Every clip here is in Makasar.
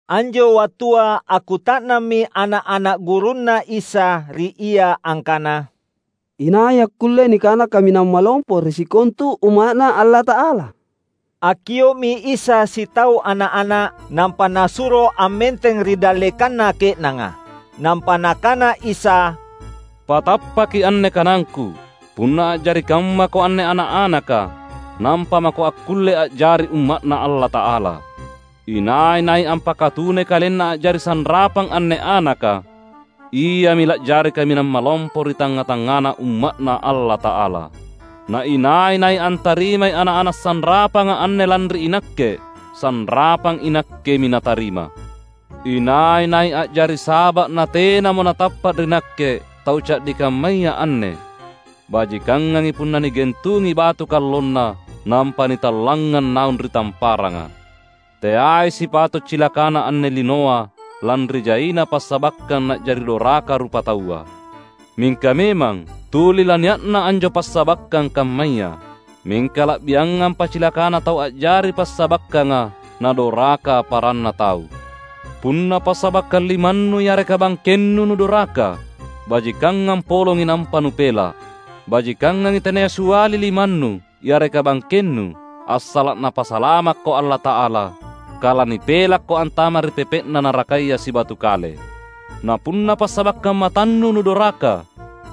Anjo wattua akkuta’nammi ana’-ana’ gurunNa Isa ri Ia angkana, "Inai akkulle nikana kaminang malompo ri sikontu umma’Na Allata’ala?" Akkio’mi Isa sitau ana’-ana’, nampa Nasuro ammenteng ri dallekanna ke’nanga. Nampa Nakana Isa, "Patappaki anne kanangKu! Punna a’jari kammako anne ana’-anaka, nampa mako akkulle a’jari umma’Na Allata’ala. Inai-nai ampakatunai kalenna a’jari sanrapang anne anaka, iami la’jari kaminang malompo ri tangnga-tangngana umma’Na Allata’ala. Na inai-nai antarimai ana’-ana’ sanrapanga anne lanri iNakke, sanrapang iNakkemi natarima." "Inai-nai a’jari saba’ natenamo natappa’ ri Nakke tau ca’di kammaya anne, bajikangangi punna nigentungi batu kallonna nampa nitallangngang naung ri tamparanga. Teai sipato’ cilakana anne linoa lanri jaina passabakkang na’jari doraka rupataua. Mingka memang tuli lania’na anjo passabakkang kammaya. Mingka la’biangampa cilakana tau a’jari passabakkanga nadoraka paranna tau! Punna passabakkang limannu yareka bangkennu nudoraka, bajikangang polongi nampa nupela’. Bajikanganji tenaya siali limannu yareka bangkennu assala’ Napasalamakko Allata’ala, kala nipelakko antama’ ri pepe’na narakaya sibatu kale. Na punna passabakkang matannu nudoraka,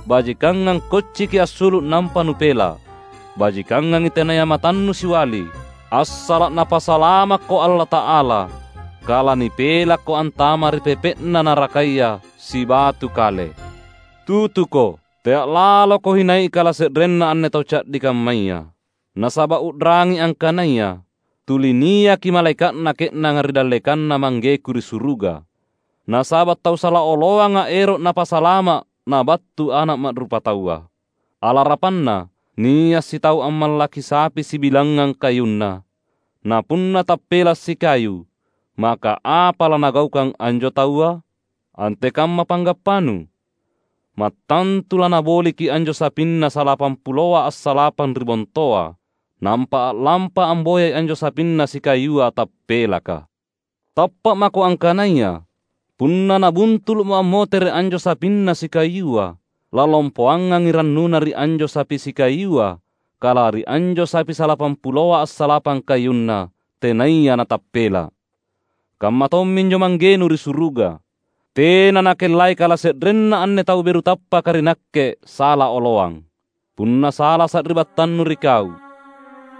bajikangang kocciki assulu’ nampa nupela’. Bajikangangi tenaya matannu siali assala’ Napasalamakko Allata’ala, kala nipelakko antama’ ri pepe’na narakaya sibatu kale." "Tutuko! Tea’ laloko hinai kalase’renna anne tau ca’di kammaya. Nasaba’ u’rangi angkanaya, tuli niaki malaeka’na ke’nanga ri dallekanNa ManggeKu ri suruga. [Nasaba' tau sala oloanga ero' Napasalama', nabattu Ana' Ma'rupataua!] Alarapanna, nia’ sitau ammallaki sapi sibilangngang kayunna. Na punna tappela’ sikayu, maka apa lanagaukang anjo taua? Antekamma panggappanu? Mattantu lanaboliki anjo sapinna salapampuloa assalapang ri bontoa, nampa a’lampa amboyai anjo sapinna sikayua tappelaka. Tappa’ mako angkanaya, punna nabuntulu’mo ammotere’ anjo sapinna sikayua, lalompoangangi rannuna ri anjo sapi sikayua kala ri anjo sapi salapampuloa assalapang kayunna, tenaya natappela’. Kamma tomminjo Manggenu ri suruga. Tena Nakellai kalase’renna anne tau beru tappaka ri Nakke sala oloang." "Punna sala sari’battannu ri kau,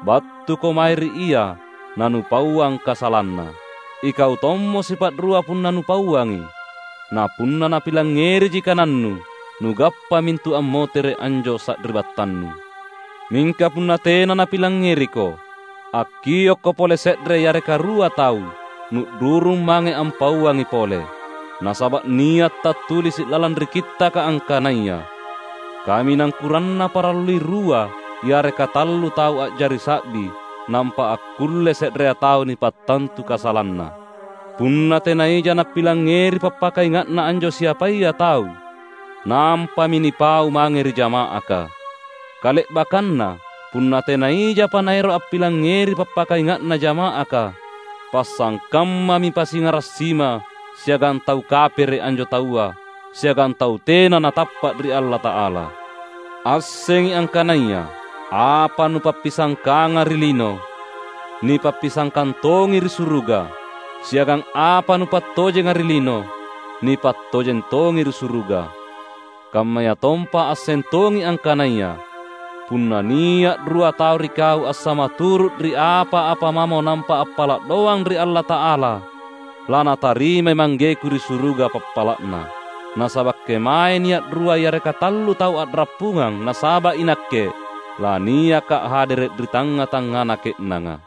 battuko mae ri ia nanupauang kasalanna. Ikau tommo sipa’rua punna nupauangi. Na punna napilangngeriji kanannu, nugappamintu ammotere’ anjo sari’battannu. Mingka punna tena napilangngeriko, akkiokko pole se’re yareka rua tau, nu’rurung mange ampauangi pole. Nasaba’ nia’ tattulisi’ lalang ri Kittaka angkanaya, ‘Kaminang kuranna parallui rua yareka tallu tau a’jari sa’bi nampa akkulle se’rea tau nipattantu kasalanna.’ Punna tena ija napilangngeri pappakainga’na anjo siapaya tau, nampami nipau mange ri jama’aka. Kale’bakkanna, punna tena ijapa naero’ ampilangngeri pappakainga’na jama’aka, pasangkammami pasingara’ sima siagang tau kapere’ anjo taua siagang tau tena natappa’ ri Allata’ala." "Assengi angkanaya: Apa nupappisangkanga ri lino, nipappisangkang tongi ri suruga. Siagang apa nupattojenga ri lino, nipattojeng tongi ri suruga. Kammayatompa asseng tongi angkanaya: Punna nia’ rua tau ri kau assamaturu’ ri apa-apa mamo nampa appala’ doang ri Allata’ala laNatarimai ManggeKu ri suruga pappala’na. Nasaba’ kemae nia’ rua yareka tallu tau a’rappungang nasaba’ iNakke, laniakKa’ hadere’ ri tangnga-tangngana ke’nanga."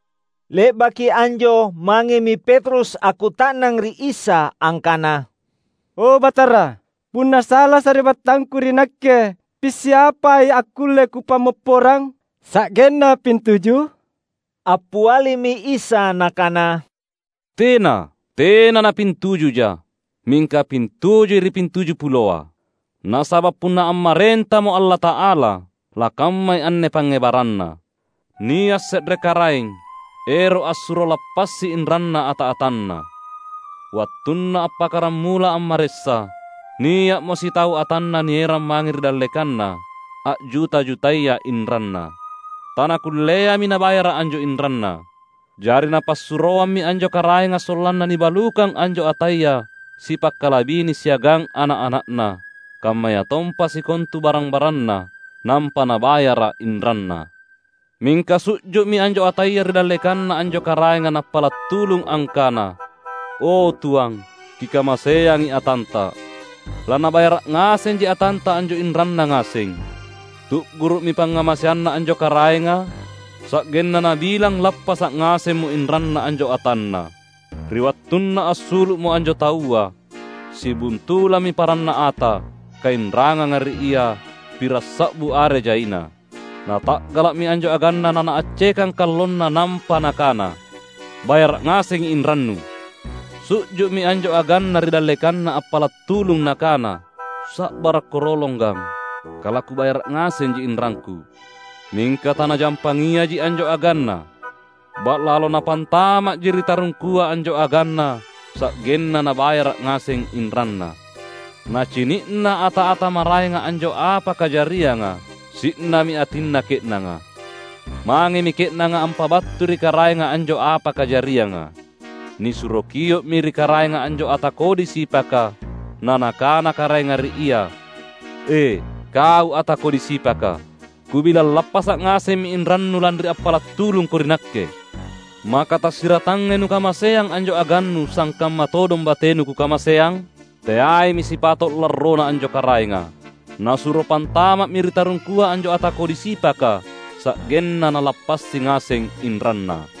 Le’baki anjo mangemi Petrus akkuta’nang ri Isa angkana, "O Batara, punna sala sari’battangku ri nakke, pissiapai akkulle kupammopporang? Sa’genna pintuju?" Appialimi Isa Nakana, "Tena, tena napintujuja, mingka pintujui ri pintujupuloa! Nasaba’ punna ammarentamo Allata’ala, lakammai anne pangngebaranna: Nia’ se’re karaeng ero’ assuro lappasi inranna ata-atanna. Wattunna appakkaramula ammaressa, nia’mo sitau atanna nierang mange ri dallekanna, a’juta-jutaya inranna. Tanakulleami nabayara’ anjo inranna. Jari napassuroammi anjo karaenga sollanna nibalukang anjo ataya sipakkalabini siagang ana’-ana’na, kammayatompa sikontu barang-baranna, nampa nabayara’ inranna. Mingka su’ju’mi anjo ataya ri dallekanna anjo karaenga nappala’ tulung angkana, ‘O Tuang, kikamaseangi atanta. Lanabayara’ ngasenji atanta anjo inranna ngaseng.’ Tu’guru’mi pangngamaseanna anjo karaenga, sa’genna nabilang lappasa’ ngasemmo inranna anjo atanna. Ri wattunna assulu’mo anjo taua, sibuntulammi paranna ata, kainranganga ri ia pirassa’bu are jaina. Nata’gala’mi anjo aganna nanaaccekang kallonna nampa nakana, ‘Bayara’ ngasengi inrannu!’ Su’ju’mi anjo aganna ri dallekanna appala’ tulung nakana, ‘Sa’barakko rolong gang, kalakubayara’ ngasenji inrangku!’ Mingka tanajampangiaji anjo aganna. Ba’lalo napantama’ji ri tarungkua anjo aganna sa’genna nabayara’ ngaseng inranna. Nacini’na ata-ata maraenga anjo apa kajarianga, si’nami atinna ke’nanga. Mangemi ke’nanga ampabattui ri karaenga anjo apa kajarianga. Nisuro kio’mi ri karaenga anjo ata kodi sipaka na nakana karaenga ri ia, ‘E kau ata kodi sipaka! Kubilang lappasa’ ngasemmi inrannu lanri appala’ tulungko ri nakke. Maka tasiratangai nukamaseang anjo agannu sangkamma todong batenu kukamaseang?’ Teaimi sipato’ larrona anjo karaenga. Nasuro pantama’mi ri tarungkua anjo ata kodi sipaka sa’genna nalappasi ngaseng inranna."